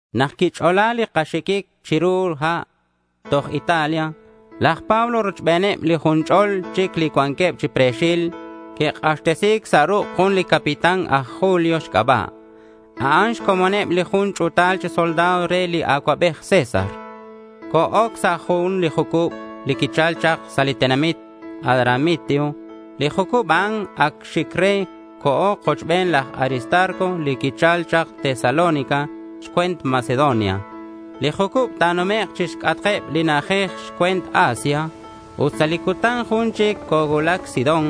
Nak quich'ola li kaxiquic chiru ha' toj Italia, laj Pablo rochbeneb li jun ch'ol chic li cuanqueb chi pre̱xil, que'k'axtesi̱c sa' ruk' jun li capitán aj Julio xc'aba'. A'an xcomoneb li jun ch'u̱tal chi soldado re li acuabej César. Co-oc sa' jun li jucub li quichal chak sa' li tenamit Adramitio. Li jucub a'an ac xic re. Co̱o kochben laj Aristarco li quichal chak Tesalónica xcue̱nt Macedonia. Li jucub ta̱numek' chixc'atk eb li na'ajej xcue̱nt Asia. Ut sa' li cutan jun chic cocuulac Sidón.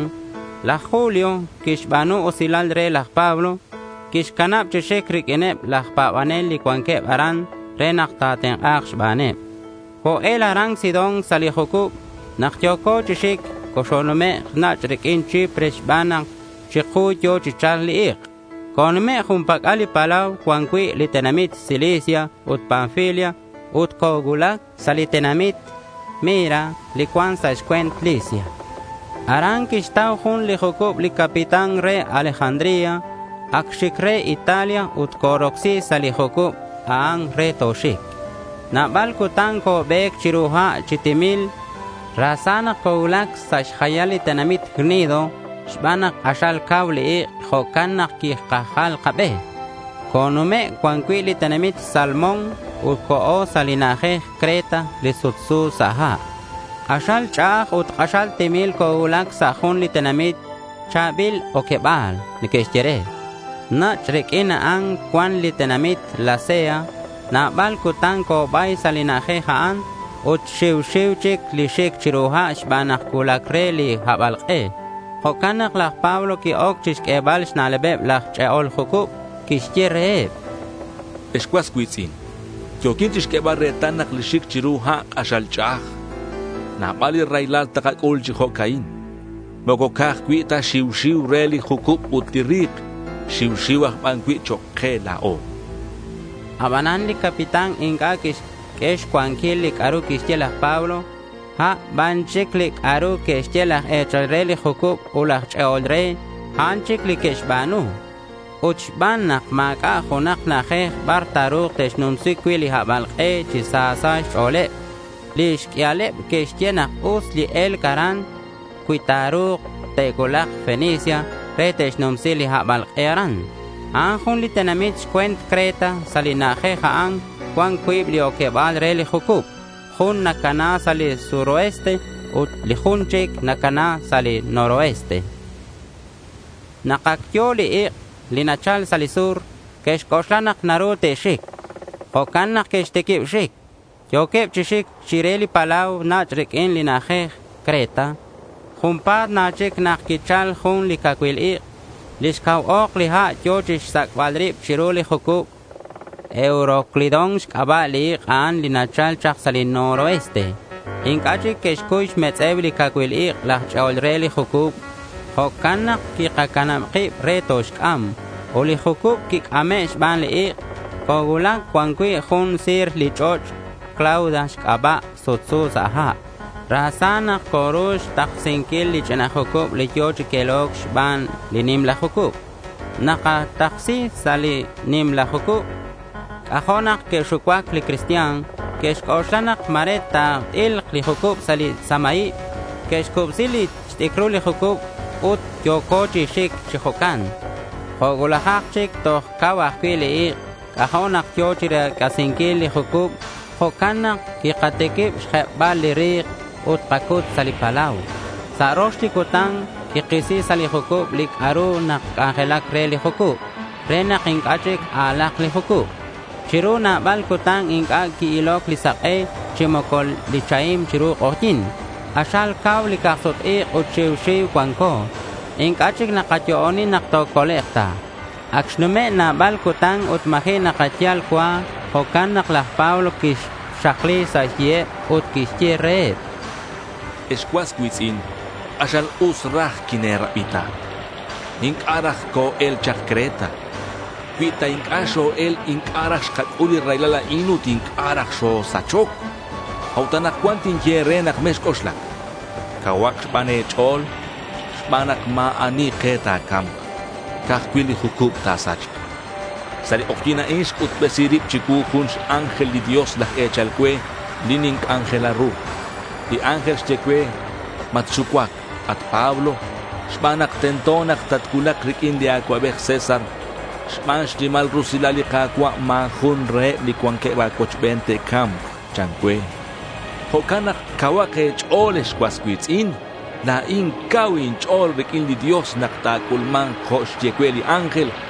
Laj Julio quixba̱nu usilal re laj Pablo. Quixcanab chi xic riq'uineb laj pa̱banel li cuanqueb aran re nak ta̱tenk'a̱k xbaneb. Co-el aran Sidón sa' li jucub. Nak yo̱co chi xic, coxonumek' nach' riq'uin Chipre xban nak chiku yo̱ chi cha̱lc li ik'. Conume' jun pac'al li palau cuan cui' li tenamit Cilicia ut Panfilia. Ut cocuulac sa' li tenamit Mira li cuan sa' xcue̱nt Licia. Aran quixtau jun li jucub li capitán re Alejandría. Ac xic re Italia ut corocsi sa' li jucub a'an re toxic. Nabal cutan cobe̱c chiru ha' chi timil. Ra sa nak cocuulac sa' xjayal li tenamit Gnido. Xban nak k'axal cau li ik', jo'can nak quikajal kabe. Conume' cuan cui' li tenamit Salmón ut co̱o sa' li na'ajej Creta li sutsu sa' ha'. K'axal ch'a'aj ut k'axal timil cocuulac sa' jun li tenamit “Cha̱bil Oqueba̱l” neque'xye re. Nach' riq'uin a'an cuan li tenamit Lasea. Nabal cutan cobay sa' li na'ajej a'an ut xiu xiu chic li xic chiru ha' xban nak cuulac re li habalk'e. Jo'can nak laj Pablo qui-oc chixq'uebal xna'lebeb laj ch'e'ol jucub. Quixye reheb: —Ex cuas cui̱tz'in, yo̱quin chixq'uebal retal nak li xic chiru ha' k'axal ch'a'aj. Nabal li raylal takac'ul chi jo'ca'in. Moco ca'aj cui' ta xiu xiu re li jucub ut li ri̱k. Xiu xiu aj ban cui' chok' ke la̱o, chan laj Pablo. Abanan li capitán inc'a' quixq'ue xcuanquil li c'a'ru quixye laj Pablo. A' ban chic li c'a'ru que'xye laj e̱chal re li jucub ut laj ch'e'ol re, a'an chic li que'xba̱nu. Ut xban nak ma̱c'a' junak na'ajej bar ta̱ru̱k te'xnumsi cui' li habalk'e chi sa sa' xch'o̱leb, li xq'uialeb que'xye nak us li e̱lc aran cui ta̱ru̱k te'cuulak Fenice re te'xnumsi li habalk'e aran. A'an jun li tenamit xcue̱nt Creta. Sa' li na'ajej a'an cuan cuib li oqueba̱l re li jucub. Jun nacana sa' li suroeste ut li jun chic nacana sa' li noroeste. Nak ac yo̱ li ik' li nachal sa' li sur, que'xc'oxla nak naru te'xic. Jo'can nak que'xtiquib xic. Yo̱queb chi xic chire li palau nach' riq'uin li na'ajej Creta. Junpa̱t na chic nak quichal jun cacuil ik'. Lix cau ok li ha' yo̱ chixsac'bal rib chiru li jucub. Euroclidón xc'aba' li ik' a'an li nachal chak sa' li noroeste. Inc'a' chic que'xcuy xmetz'e̱u li cacuil ik' laj ch'e'ol re li jucub. Jo'can nak quikacanab kib re toxc'am. Ut li jucub quic'ame' xban li ik'. Cocuulac cuan cui' jun si̱ril li ch'och' Clauda xc'aba' sutsu sa' ha'. Ra sa nak coru xtaksinquil li ch'ina jucub li yo̱ chi quelo̱c xban li nimla jucub. Nak kataksi sa' li nimla jucub, c'ajo' nak que'xucuac li cristian. Que'xc'oxla nak ma̱re ta̱t'ilk li jucub sa' li samaib. Que'xcubsi xt'icrul li jucub ut yo̱co chi xic chi jo'can. Jo' cuulajak chic toj cau ajcui' li ik'. C'ajo' nak yo̱ chirec'asinquil li jucub. Jo'can nak quikatiquib xjebbal li ri̱k ut kacut sa' li palau. Sa' rox li cutan quikisi sa' li jucub li c'a'ru nac'anjelac re li jucub, re nak inc'a' chic a̱lak li jucub. Chiru nabal cutan inc'a' qui-iloc li sak'e chi moco li chahim chiru k'ojyi̱n. K'axal cau li cak-sut-ik' ut xiu xiu cuanco. Inc'a' chic nakayo'oni nak tocolek' ta. Ac xnume' nabal cutan ut ma̱ji' nakayal cua. Jo'can nak laj Pablo quixakli sa' xyiheb ut quixye reheb: —Ex cuas cui̱tz'in, k'axal us raj quine̱rabi ta. Inc'a' raj co-el chak Creta. Cui ta inc'a' xo-el, inc'a' raj xkac'ul li raylal a'in ut inc'a' raj xosachoc. A'ut anakcuan tinye e̱re nak mexc'oxlac. Cauhak ban e̱ch'o̱l xban nak ma̱ ani ke ta̱ca̱mk. Ca'aj cui' li jucub ta̱sachk. Sa' li k'ojyi̱n a'in xc'utbesi rib chicuu jun x-ángel li Dios laj e̱chal cue, li ninc'anjela ru. Li ángel xye cue, “Matxucuac, at Pablo, xban nak tento nak tatcuulak riq'uin li acuabej César. Xban xnimal rusilal li Ka̱cua', ma̱ jun reheb li cuanqueb a̱cuochben te'ca̱mk,” chan cue. Jo'can nak cauhak e̱ch'o̱l, ex cuas cui̱tz'in. La̱in cau inch'o̱l riq'uin li Dios nak ta̱c'ulma̱nk jo' xye cue li ángel.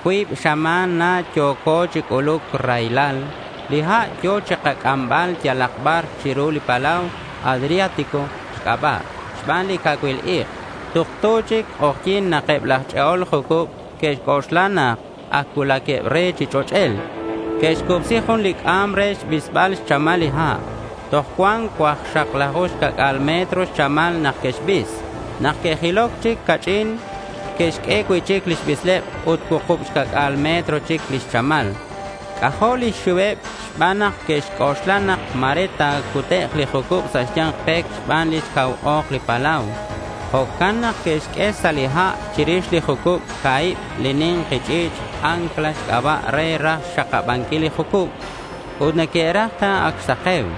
Cuib xama̱n na yo̱co chi c'uluc raylal. Li ha' yo̱ chikac'ambal yalak bar chiru li palau Adriático xc'aba' xban li cacuil ik'. Tuktu chic k'ojyi̱n nak eb laj ch'e'ol jucub que'xc'oxla nak ac cuulaqueb re chi ch'och'el. Que'xcubsi jun li c'am re xbisbal xchamal li ha'. Toj cuan cuaklaju xca̱c'a̱l metro xchamal nak que'xbis. Nak que'jiloc chic ca'ch'in, que'xq'ue cui'chic li bisleb ut cuukub xca'c'a̱l metro chic lix chamal. C'ajo' lix xiuheb xban nak que'xc'oxla nak ma̱re ta̱cutek' li jucub sa' xya̱nk pec xban lix cau ok li palau. Jo'can nak que'xq'ue sa' li ha' chirix li jucub ca̱hib li ni̱nki ch'i̱ch' ancla xc'aba' re raj xxakabanquil li jucub. Ut neque'raj ta ac xsake̱u.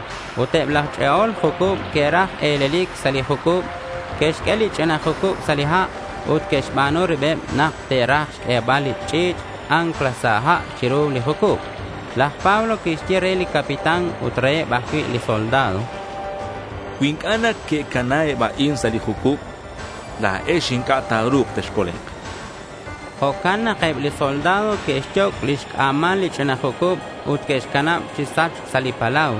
Ut eb laj ch'e'ol jucub que'raj e̱lelic sa' li jucub. Que'xq'ue li ch'ina jucub sa' ha' ut que'xba̱nu ribeb nak te'raj xq'uebal li ch'i̱ch' ancla sa' ha' chiru li jucub. Laj Pablo quixye re li capitán ut reheb ajcui' li soldado: —Cui inc'a' neque'cana eb a'in sa' li jucub, la̱ex inc'a' ta̱ru̱k texcolek', chan. Jo'can nak eb li soldado que'xyoc' lix c'a̱mal li ch'ina jucub ut que'xcanab chi sachc sa' li palau.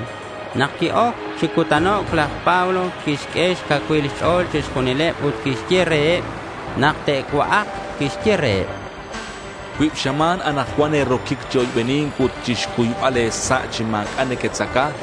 Nak qui-oc chi cutanoc', laj Pablo quixq'ue xcacuilal xch'o̱leb chixjunileb ut quixye reheb nak te'cua'ak. Quixye reheb: —Cuib xama̱n anakcuan e̱roquic chi oybeni̱nc ut chixcuybal e̱sa' chi ma̱c'a' nequetzaca.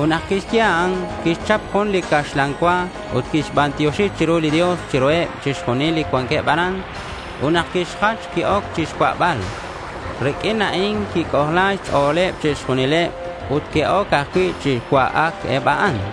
Ut nak quixye a'an, quixchap jun li caxlan cua ut quixbantioxi chiru li Dios chiruheb chixjunileb li cuanqueb aran. Ut nak quixjach, qui-oc chixcua'bal. Riq'uin a'in quic'ojla xch'o̱leb chixjunileb ut que'oc ajcui' chi cua'ac eb a'an.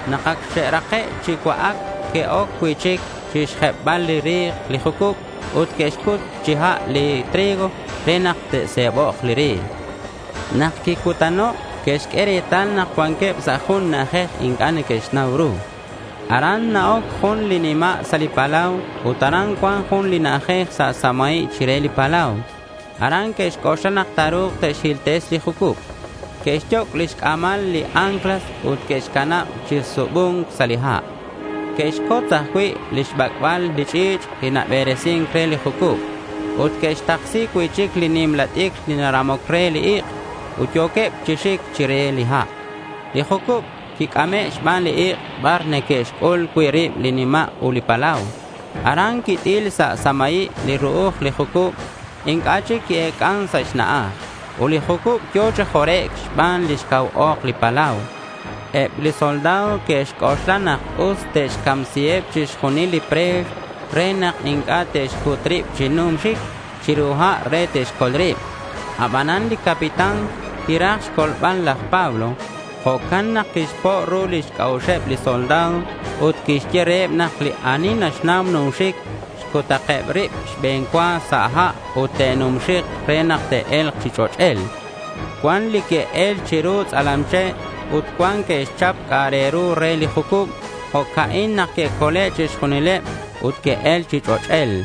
Nak ac xe'rake' chi cua'ac, que'oc cui'chic chixjebbal li ri̱k li jucub ut que'xcut chi ha' li trigo re nak ta̱se̱bok' li ri̱k. Nak quicutano' que'xq'ue retal nak cuanqueb sa' jun na'ajej inc'a' neque'xnau ru. Aran na-oc jun li nima' sa' li palau ut aran cuan jun li na'ajej sa' samaib chire li palau. Aran que'xc'oxla nak ta̱ru̱k te'xhiltesi li jucub. Que'xyoc' lix c'a̱mal li anclas ut que'xcanab chi subu̱nc sa' li ha'. Que'xcotz ajcui' lix bac'bal li ch'i̱ch' li naberesin re li jucub. Ut que'xtaksi cui'chic li nimla t'icr li naramoc re li ik'. Ut yo̱queb chi xic chire li ha'. Li jucub quic'ame' xban li ik' bar neque'xc'ul cui' rib li nima' ut li palau. Aran quit'il sa' samaib li ru'uj li jucub. Inc'a' chic qui-ec'an sa' xna'aj. Ut li jucub yo̱ chi jorec' xban lix cau ok li palau. Eb li soldado que'xc'oxla nak us te'xcamsiheb chixjunil li pre̱x re nak inc'a' te'xcut rib chi numxic chiru ha' re te'xcol rib. Abanan li capitán quiraj xcolbal laj Pablo. Jo'can nak quixpo' ru lix c'a'uxeb li soldado ut quixye reheb nak li ani naxnau numxic xcutakeb rib xbe̱n cua sa' ha' ut te'numxik re nak te'e̱lk chi ch'och'el. Cuan li que'el chiru tz'alam che' ut cuan que'xchap c'a'ak re ru re li jucub. Jo'ca'in nak que'cole' chixjunileb ut que'el chi ch'och'el.